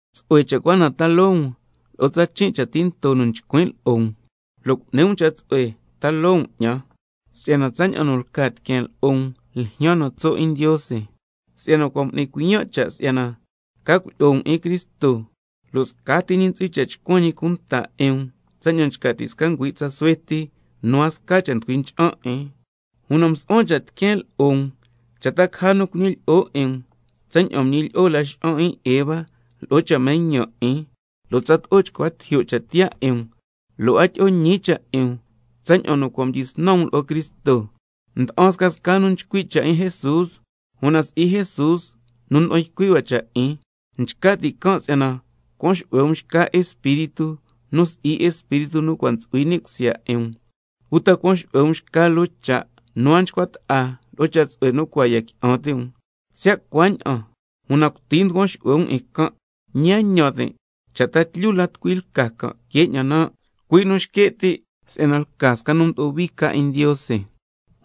Tsu'hue ca cha' cua na taa loo um lo'o tsa chin' cha' tinto nu chcuin' lo'o um, lo' cu'ni um cha' tsu'hue taa loo um 'ñan. Si'yana tsaña'an nu lca tiqueen lo'o um ljyaan na tso' 'in Ndiose, si'yana cua' m'nin cuiyan' cha' si'yana ca cuilyi'o um 'in Cristo, lo' scati ñi ntsu'hui cha' chcuan ñi cunta 'in um tsaña'an nchca ti' sca ngüi' tsa suhue ti nu a sca cha' nducui ncha'an 'in. Una msu'huan cha' tiqueen lo'o um cha' caja nu cuñilyi'o 'in um tsaña'an nu nguñilyi'o laxa'an 'in Eva lo'o cha' mañan 'in, lo' tsato'o chcua tijyo' cha' tiyaa 'in um lo' a tyi'o ñi cha' 'in um tsaña'an nu cua' mdyisnan um lo'o Cristo. Nda'an scasca nu nchcui' cha' 'in Jesús, una si'i Jesús nu nda'an ycui' hua cha' 'in. Nchca ti' can' si'yana cuan xu'hue um xca espíritu nu si'i Espíritu nu cua' ntsu'hui ni' cusya 'in um, uta cuan xu'hue um xca loo cha' nu a nchcua ta'a lo'o cha tsu'hue nu cua' ya qui'an ti' um. Siya' cuaña'an una cuti nducuan xu'hue um 'in can', ñi a ñan tin' cha' ta tlyu la tucui lca can' que 'ñan nan', cui' nu nxque' ti' si'yana lca sca nu mdo'o hui ca 'in Ndiose.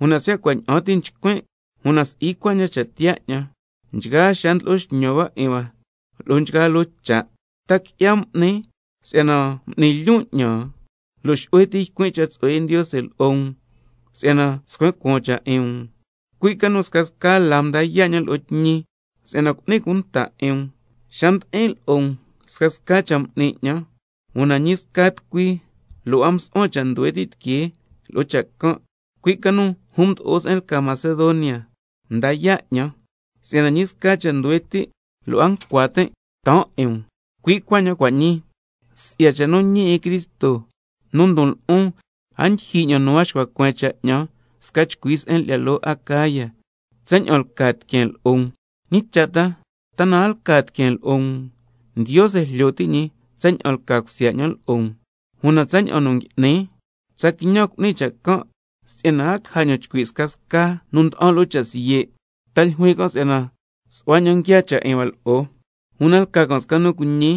Una siya' cua' ña'an ti nchcuin', una si'i cuaña'an cha' tiyaa 'ñan, nchgaa xaa ndlo'o xñan hua 'in hua lo'o nchgaa loo cha'. ¿Ta qui'ya m'nin si'yana m'ni lyon' 'ñan, lo' xu'hue ti ycuin' cha' tsu'hue 'in Ndiose lo'o um, si'yana scuen cuaan cha' 'in um? Cui' ca nu scasca laa mda yaa' 'ñan lo'o tñi, se'en nu cu'nin cunta 'in um. Xa mdi'in lo'o um scasca cha' m'nin 'ñan, una ñi sca tucui lo' a msu'huan cha' nduhue ti' tiquee lo'o cha' can', cui' ca nu jun nu mdo'o se'en lyi'ya loo Macedonia mda yaa' 'ñan, si'yana ñi sca cha' nduhue ti' lo' a ncua tin' taan 'in um, cui' cuaña'an cua' ñii. Si'ya cha' nu ñi 'in Cristo nu ndon lo'on, sca chcui se'en lyi'ya loo Acaya, lo' a ndyijyi ña'an nu a xcua cueen cha' 'ñan tsaña'an lca tiqueen lo'o um. ¿Ñi cha' ta? ¿Ta na a lca tiqueen lo'o um? Ndiose jlyo ti' ñi tsaña'an lca cusya 'ñan lo'o um. Una tsaña'an nu ngui'nin, tsa quiñan cu'nin cha' can', si'yana a caja ña'an chcui' scasca nu nda'an lo'o cha' siye', ta ljuin can' si'yana su'hua ña'an nguiaa cha' 'in hua lo'o. Una lca can' sca nu cuiñi,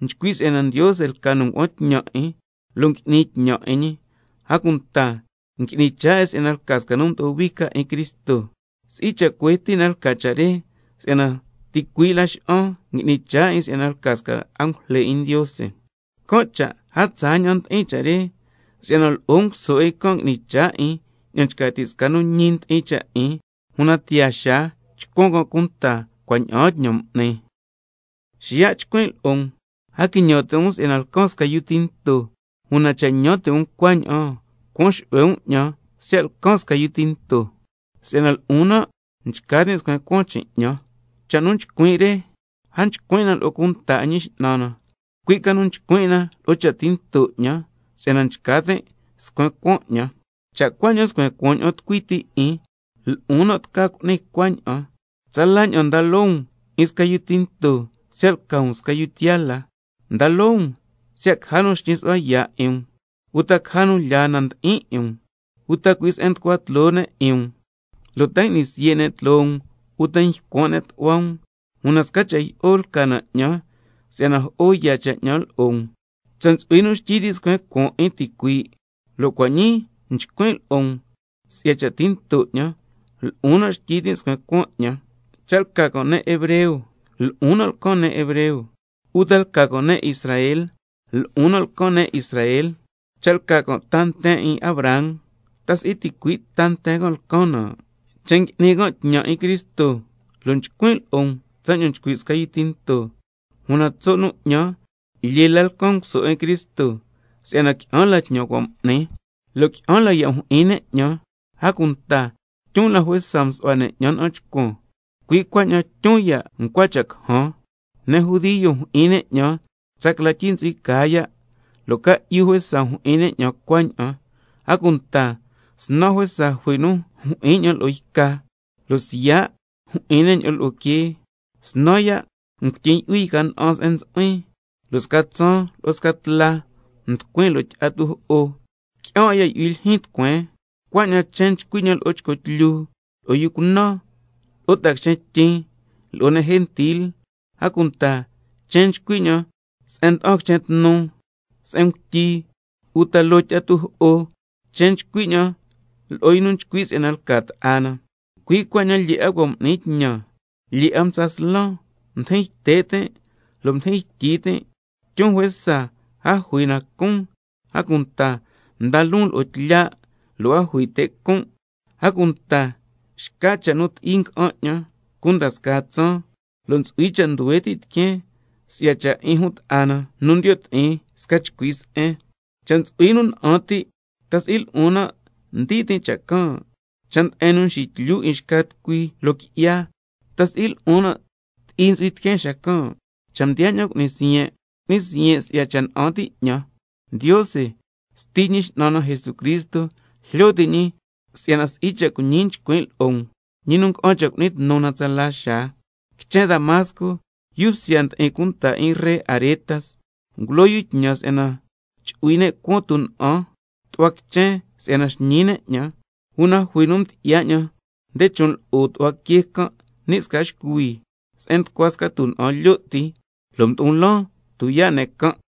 nchcui' si'yana Ndiose lca nu ngua'an tñan 'in lo' ngui'ni tñan 'in ñi, a cunta ngui'ni chaa 'in si'yana lca sca nu mdo'o hui ca 'in Cristo. Si'i cha' cuhue ti' na lca cha' re, si'yana ticuii' Laxa'an ngui'ni chaa 'in si'yana lca sca angujle 'in Ndiose, can' cha' a tsaa ña'an ndi'in cha' re, si'yana lo'o nguso 'in can' ngui'ni chaa 'in ña'an nchca ti' sca nu ñi ndi'in cha' 'in, una tiyaa xaa chcuan can' cunta cua' ña'aan tñan m'ni. Xiya' chcuin' lo'o um: A quiñan ti' um si'yana lcan sca yu tinto, una cha' ñan ti' um cuaña'an, cuan xu'hue um 'ñan siya' lcan sca yu tinto, si'yana lo'on nan' nchca tin' scuen cuaan chin' 'ñan. Cha' nu chcuin' re, a chcuin' 'in na lo'o cunta 'in Ñi X'nan na, cui' ca nu chcuin' 'in na lo'o cha' tinto 'ñan, si'yana nchca tin' scuen cuaan 'ñan. Cha' cuaña'an nscuen cuaan ña'an tucui ti 'in, lo'on nan' tca cu'nin cuaña'an, tsala ña'an nda loo um 'in sca yu tinto, siya' lca um sca nu tiyaa la. Nda loo um siya' caja nu xñi su'hua yaa' 'in um, uta caja nu lyaa na nu ndi'in 'in um, uta cui' se'en nducua tloo ne' 'in um, lo' ta ngui'ni siye' ne' tloo um, uta ycuan' ne' tu'hua um. Una sca cha' jyi'o lca na 'ñan si'yana jo'o yaa cha' 'in hua lo'o um. Cha' ntsu'hui nu xtyi ti' scuen cuaan 'in ticuii' (lo' cua' ñii nchcuin' lo'o um si'ya cha' tinto 'ñan), una lo'on nan' xtyi tin' scuen cuaan 'ñan. Cha' lca can' ne' hebreo, lo'on nan' lcan ne' hebreo. Uta lca can' ne' Israel, lo'on nan' lcan ne' Israel. Cha' lca can' ta nten 'in Abraham, ¿ta si'i ticui' ta nten can' lcan nan'? Cha' ngui'ni can' tñan 'in Cristo (lo' nchcuin' lo'o um tsaña'an nchcui' sca yu tinto), una tso' nu 'ñan lyee la lcan nguso 'in Cristo, si'yana qui'an la tñan nu cua' m'nin, lo' qui'an la ya' mjyi'in ne' 'ñan, a cunta tyun la juesa msu'hua ne' 'ñan na'an chcuan, cui' cuaña'an tyun ya' ncua cha' cajan. Ne' judio mjyi'in ne' 'ñan tsa cla tyi ntsu'hui caa ya', lo' ca'yu juesa mjyi'in ne' 'ñan tsa cuaña'an. A cunta snan juesa jui nu mjyi'in 'ñan lo'o yca, lo' siya' mjyi'in ne' 'ñan lo'o quee, snan ya' ngutyin' yu'hui yca na'an se'en ntsu'huin, lo' sca tsaan lo' sca tla mducuin loo tyi'a tujo'o. Qui'an 'a ya' yu'hui lyijyin tucueen, cuaña'an chen nchcui 'ñan lo'o chco tlyu, lo'o yu cunan, lo'o ta'a quichen tyin, lo'o ne' gentil, a cunta chen nchcui 'ñan se'en mda'an quichen tnu, se'en ngutyi, uta loo tyi'a tujo'o, chen nchcui 'ñan lo'o yu nu nchcui' si'yana lca ta'a na. Cui' cuaña'an lyee 'a cua' m'nin tñan, lyee 'a mtsa slan, mdijin yte' tin' lo' mdijin ytyi tin', tyun juesa a jui na nu cun, a cunta mdan loon lo'o tlya' lo' a jui te' con'. A cunta xca cha' nu ti'i nga'an 'ñan cunda scaa tsaan, lo' ntsu'hui cha' nduhue ti' tiqueen si'ya cha' 'in jun ta'a na nu ndiyo' ti'in sca chcui se'en. Cha' ntsu'hui nu na'an ti', ¿ta si'i lo'on nan' ndii tin' cha' can'? Cha' nde'en nu mxityu 'in xca tucui loo qui'ya, ¿ta si'i lo'on nan' ti'i ntsu'hui tiqueen xacan'? Cha' mdiyaa ña'an cu'nin siyen', cu'nin siyen' si'ya cha' na'an ti' 'ñan. Ndiose, Sti Ñi X'nan na Jesucristo, jlyo ti' ñi si'yana si'i cha' cuiñi nchcuin' lo'o um, ñi nu nga'an cha' cu'ni tnu na 'in tsala xaa. Quichen Damasco, yu bsya ndi'in cunta 'in ree Aretas ngulo yu tñan si'yana chu'hui ne' cuan tuna'an tu'hua quichen si'yana xñi ne' 'ñan, una jui nu mdyi'ya 'ñan nde chon' lo'o tu'hua quee can' ni' sca xcuhui se'en nducua sca tuna'an lyo' ti, lo' mdo'o laan tuyaa' ne' can'.